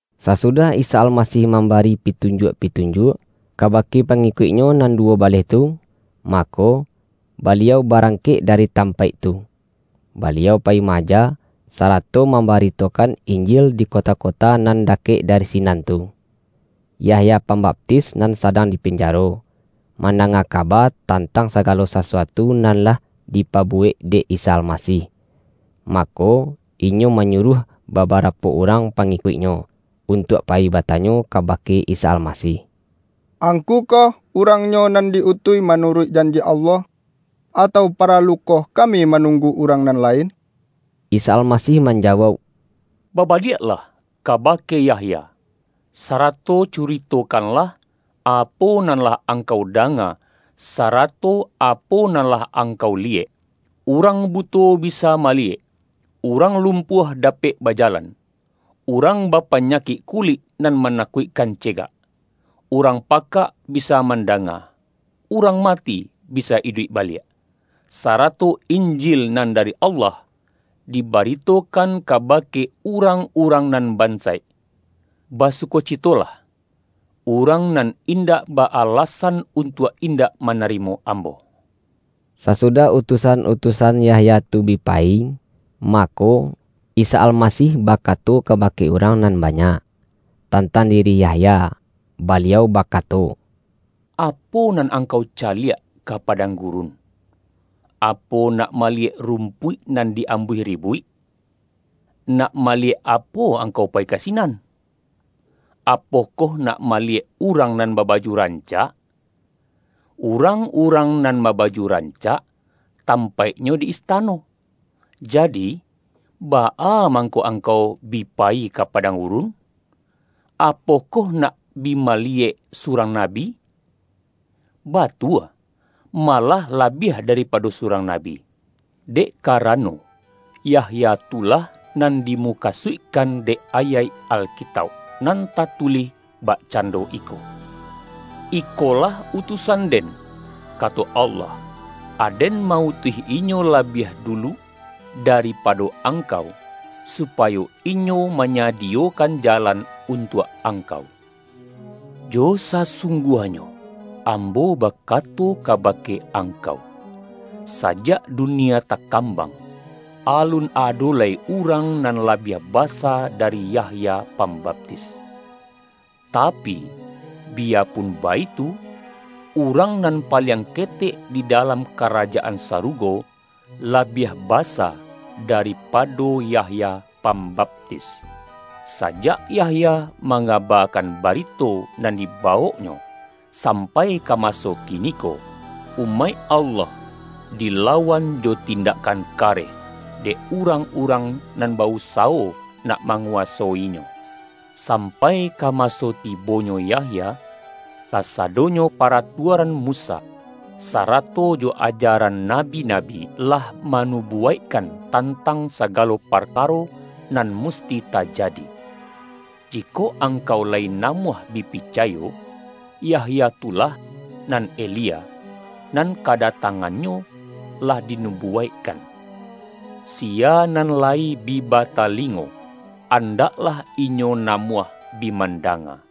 Sasudah Isa Almasih mamba-ri pitunjuak-pitunjuak, kaba-ke pangikuik-Nyo nan duwo baleh tu, mako, Baliau barangkek dari tampaik tu. Baliau payi ma-aja, sarato mam-baritokan Injil di kota-kota nan dakek dari sinan tu. Yahya Pambaptis nan sadang di pinjaro, mandanga kaba tantang saga-lo sasuatu nan lah dipabuwek dek Isa Almasih. Mako, inyo manyuruah baba-rapo urang pangikuiknyo, untuak payi batanyo kabake Isa Almasih, ”Angku koh urangnyo, nan di-utuih manuruik janji Allah, atau paralukoh kami ma-nunggu urang nan lain?” Isa Almasih manjawauk,”Babaliak-lah kabake Yahya, sarato curitokanlah, apo nan lah angkau danga, sara-to apo nan lah angkau liyek: Urang buto bisa maliyek, urang lumpuah da-pek bajalan, urang bapanyakik kulik nan manakuikkan cegak; urang pakak bisa mandanga, urang mati bisa iduik baliak, sarato Injil nan dari Allah, di-baritokan kabake urang-urang nan bansaik. Basukocitolah urang nan indak ba-alasan, untuak indak ma-narimo Ambo!” Sasudah utusan-utusan Yahya tu bi payi, mako, Isa Almasih bakato ka-bake urang nan banyak, tantang diri Yahya. Baliau bakato,”Apo nan ang-kau caliak ka padang gurun? Apo nak maliyek rumpuik nan di-ambuih ri-buik? Nak maliyek apo angkau payi ka sinan? Apokoh nak maliyek urang nan babaju rancak? Urang-urang nan babaju rancak, tampaiknyo di istano! Jadi, baa mangko angkau bi payi ka padang gurun? Apokoh nak bi mali-yek surang nabi? Batua, malah labiah daripado surang nabi. Dek kara-no, Yahya tu lah nan dimukasuikkan dek ayaik Alkitauk, nan tatulih bak-cando iko, Ikolah utusan-Den, kato Allah, Aden ma-utuih inyo labiah dulu daripado Angkau supayo inyo manyadiyokan jalan untuak Angkau.’ Jo sasungguahnyo, Ambo bakato kabake angkau! Sajak dunia takam-bang, alun ado lai urang nan labiah basa dari Yahya Pambaptis. Tapi, bi-yapun baitu, urang nan paliang ketek di dalam Karajaan Sarugo, labiah ba-sa daripado Yahya Pambaptis. Sajak Yahya mangabakan barito nan diba-woknyo, sampai ka maso kiniko, umaik Allah dilawan jo tindakkan kareh, dek urang-urang nan ba-usawo nak ma-nguwasoinyo. Sampai ka maso ti-bonyo Yahya, kasadonyo paratuaran Musa, sarato jo ajaran nabi-nabi, lah manubuwaikkan tantang sagalo par-karo nan musti tajadi. Jikok angkau layi namuah bi picayo, Yahya tu lah, nan Elia, nan kadatangannyo lah di-nubuwaikkan. Siya nan lai bi bata-lingo, andaklah inyo namuah bi man-danga!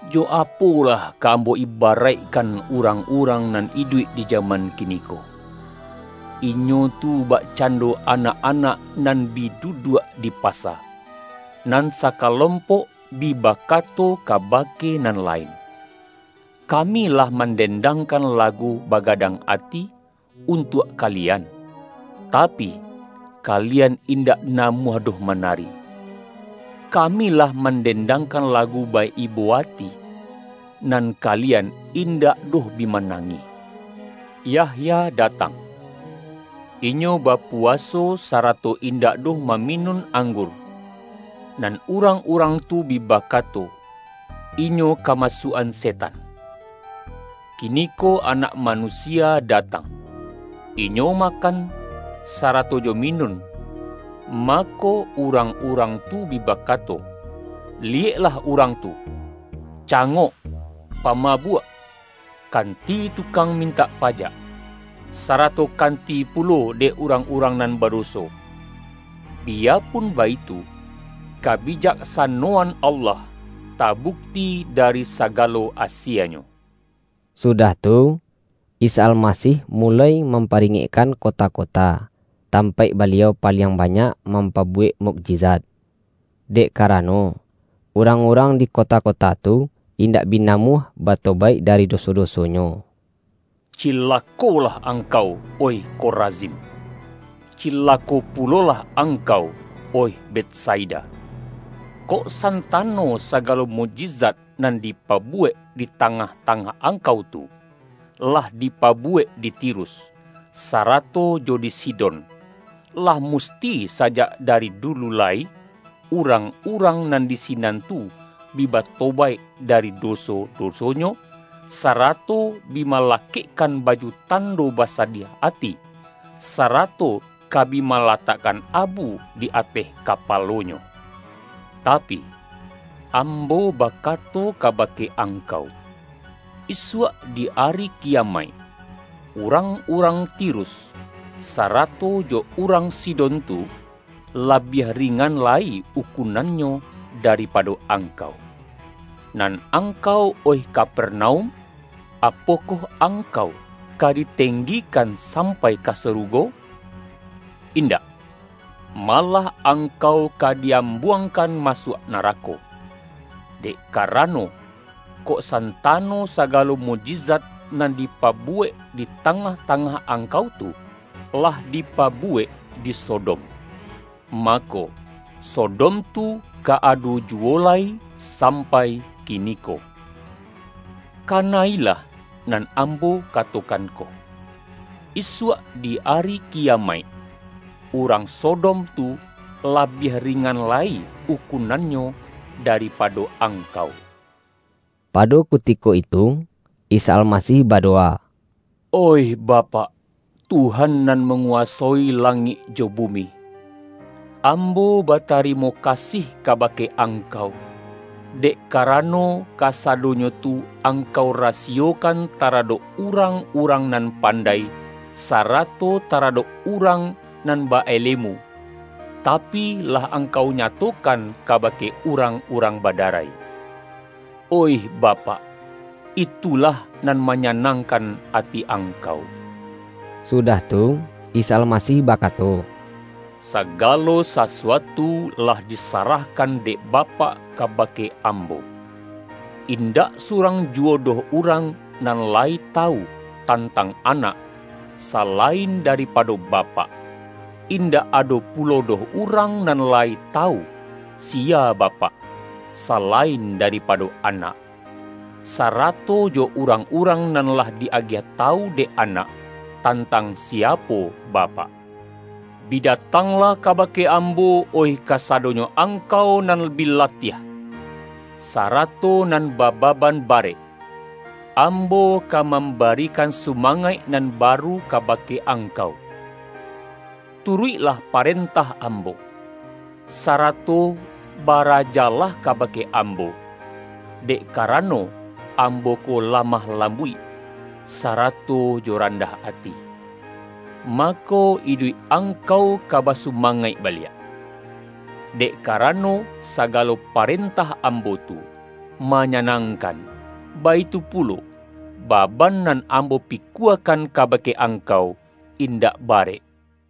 Jo apolah ka Ambo ibaraikkan urang-urang nan iduik di jaman kini-ko? Inyo tu bakcando anak-anak nan bi duduak di pasa. Nan sakalompok bi bakato kabake nan lain, ’Kami lah mandendangkan lagu bagadang ati, untuak kalian, tapi, kalian indak namuah doh manari! Kami lah man-dendangkan lagu ba-ibo ati, nan kali-an, indak doh bi manangih!’ Yahya datang,— inyo bapuwaso, sarato indak doh maminun anggur; nan urang-urang tu bi bakato, ’Inyo kamasuak-an se-tan!’ Kiniko Anak Manusia datang, — Inyo makan, sarato jo minun; ma-ko, urang-urang tu bi bakato, ’Liyek-lah urang tu! Cangok, pamabuak, kan-ti tukang mintak pajak, sarato kanti pulo dek urang-urang nan badoso.’ Bi-yapun baitu, kabijaksanoan Allah ta-bukti dari sagalo asienyo.” Sudah tu, Isa Almasih muloi mam-paringekkan kota-kota, tampaik Baliau paliang banyak mampabuwek mukji-zat. Dek karano, urang-urang di ko-ta-kota tu, indak bi namuah batobaik dari doso-dosonyo. ”Cilakolah ang-kau, oih Korazim! Cilako pulolah ang-kau, oih Betsaida! Kok santano sagalo mukjizat nan dipabuwek di tangah-ta-ngah angkau tu, lah dipabuwek di Ti-rus, sarato jo di Sidon, lah musti sa-jak dari dulu lai, urang-urang nan di sinan tu bi batobaik dari doso-doso-nyo, sarato bi malakekkan baju tando basadiah ati, sarato ka bi malatakkan abu di ateh kapalonyo. Tapi, Ambo bakato kabake angkau, isuak di Ari Kiyamaik, urang-urang Tirus, sarato jo urang Sidon tu, labiah ringan lai ukunannyo daripado angkau! Nan angkau, oih Kapernaum! Apokoh ang-kau ka ditenggikan sampai ka saru-go? Indak! Malah angkau ka di-am-buangkan masuak narako! Dek karano, kok santano sagalo mukjizat nan di-pabuwek di tangah-tangah angkau tu, lah dipabuwek di Sodom, mako, So-dom tu ka ado juwo lai sampai kiniko! Kana-ilah nan Ambo katokan ko, isuak di Ari Kiyamaik, urang Sodom tu labiah ringan lai ukunannyo dari-pado angkau!” Pado kutiko itu, Isa Almasih ba-dowa,”Oih Bapak, Tuhan nan mangu-wasoi langik jo bumi! Ambo batari-mo kasih kabake Angkau, dek karano, kasadonyo tu Angkau rasiyokan tara-dok urang-urang nan pandai, sarato taradok urang nan ba-alemu, tapi, lah Angkau nyatokan kabake urang-urang badarai. Oih Bapak, itulah nan ma-nyanangkan ati Angkau.” Sudah tu, Isa Almasih bakato,”Sa-galo sasuatu lah disarahkan dek Bapak kabake Ambo. Indak surang juwo doh urang nan layi tawu, tantang Anak, salain daripado Bapak. Indak ado pulo doh urang nan layi tawu, siya Bapak, salain daripado Anak, sarato jo urang-urang nan lah di agiah tawu dek Anak, tantang siapo Bapak. Bi datanglah kabake Ambo, oih kasadonyo angkau nan bi latiah, sara-to nan bababan barek; Ambo ka mam-barikan sumangaik nan baru kabake angkau. Turuiklah parentah Ambo, sarato barajalah kabake Ambo. Dek karano, Ambo ko lamah lambuik, sa-rato jo randah ati, mako, iduik ang-kau ka basumangaik baliak. Dek karano, sagalo parentah Ambo tu, ma-nyanangkan, baitu pulo, baban nan Ambo pikuakan kabake angkau, in-dak barek.”